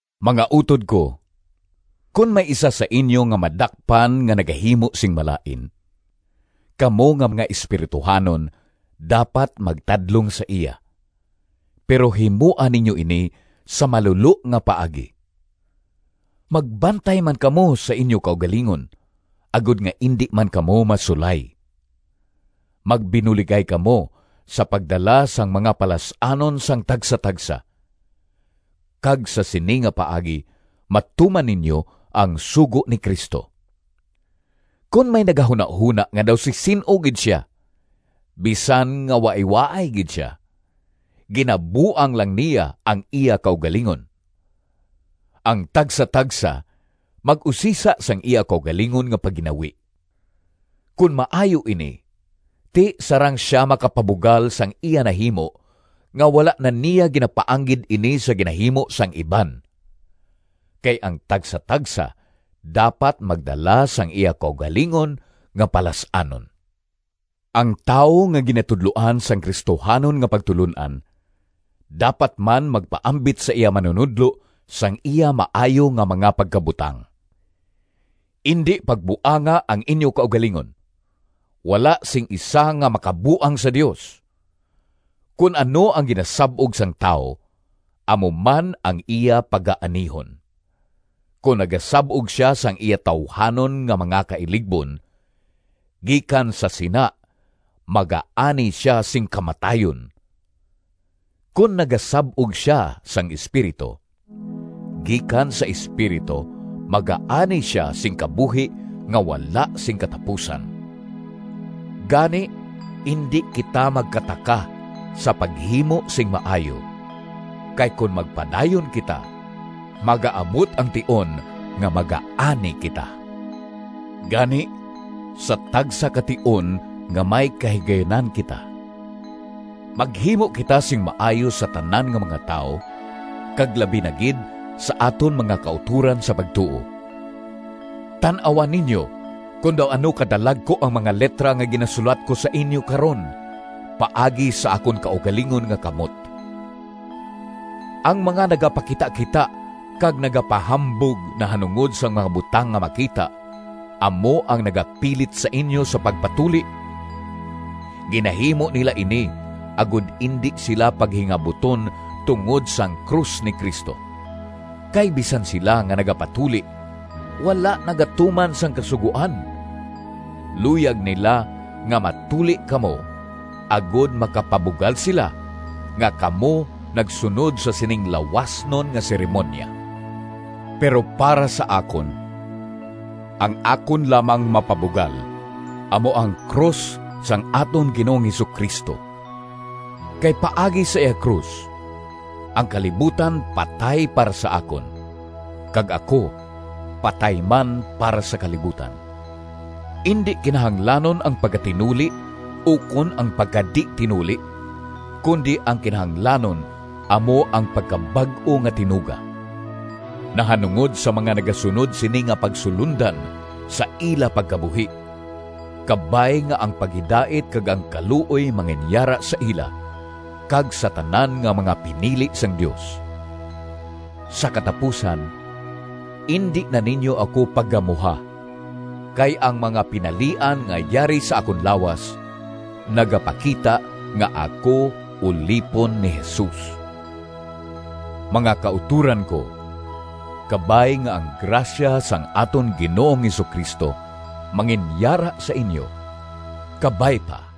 Mga utod ko, kon may isa sa inyo nga madakpan nga nagahimo sing malain, kamo nga mga espirituhanon dapat magtadlong sa iya, pero himoa ninyo ini sa malulo nga paagi. Magbantay man kamo sa inyo kaugalingon, agod nga indi man kamo masulay. Magbinuligay kamo sa pagdala sang mga palas-anon sang tagsatagsa, kag sa sini nga paagi matuman ninyo ang sugo ni Cristo. Kon may nagahunahona nga daw si sin-o gid sia, bisan nga waaywaay gid sia, ginabuang lang niya ang iya kaugalingon. Ang tagsatagsa mag-usisa sang iya kaugalingon nga pagginawi. Kon maayo ini, ti sarang sia makapabugal sang iya nahimo nga wala na niya ginapaanggid ini sa ginahimo sang iban. Kay ang tagsatagsa dapat magdala sang iya kaugalingon nga palas-anon. Ang tawo nga ginatudloan sang Cristohanon nga pagtulon-an dapat man magpaambit sa iya manunodlo sang iya maayo nga mga pagkabutang. Indi pagbuanga ang inyo kaugalingon. Wala sing isa nga makabuang sa Dios. Kon ano ang ginasab-og sang tawo amo man ang iya pagaanihon. Kon nagasab-og sia sang iya tawuhanon nga mga kailigbon, gikan sa sina magaani sia sing kamatayon. Kon nagasab-og sia sang Espiritu, gikan sa Espiritu magaani sia sing kabuhi nga wala sing katapusan. Gani, indi kita magkataka sa paghimo sing maayo, kay kon magpadayon kita, magaabot ang tion nga magaani kita. Gani, sa tagsa ka tion nga may kahigayunan kita, maghimo kita sing maayo sa tanan nga mga tawo kag labi na gid sa aton mga kautoran sa pagtuo. Tan-awa ninyo kon daw ano ka dalagku ang mga litra nga ginasulat ko sa inyo karon paagi sa akon kaugalingon nga kamot! Ang mga nagapakitakita kag nagapahambog nahanungod sang mga butang nga makita, amo ang nagapilit sa inyo sa pagpatuli. Ginahimo nila ini, agod indi sila paghingabuton tungod sang krus ni Cristo. Kay bisan sila nga nagapatuli wala nagatuman sang Kasugoan. Luyag nila nga matuli kamo agod makapabugal sila nga kamo nagsunod sa sining lawasnon nga seremoniya. Pero para sa akon, ang akon lamang mapabugal amo ang krus sang aton Ginoong Jesu-Cristo, kay paagi sa iya krus ang kalibutan patay para sa akon kag ako patay man para sa kalibutan. Indi kinahanglanon ang pagkatinuli ukon ang pagkadi-tinuli, kundi ang kinahanglanon amo ang pagkabag-o nga tinuga. Nahanungod sa mga nagasunod sini nga pagsulondan sa ila pagkabuhi, kabay nga ang paghidait kag ang kaluoy manginyara sa ila, kag sa tanan nga mga pinili sang Dios. Sa katapusan: indi na ninyo ako paggamuha, kay ang mga pinalian nga yari sa akon lawas nagapakita nga ako ulipon ni Jesus. Mga kautoran ko, kabay nga ang grasya sang aton Ginoong Jesu-Cristo manginyara sa inyo. Kabay pa.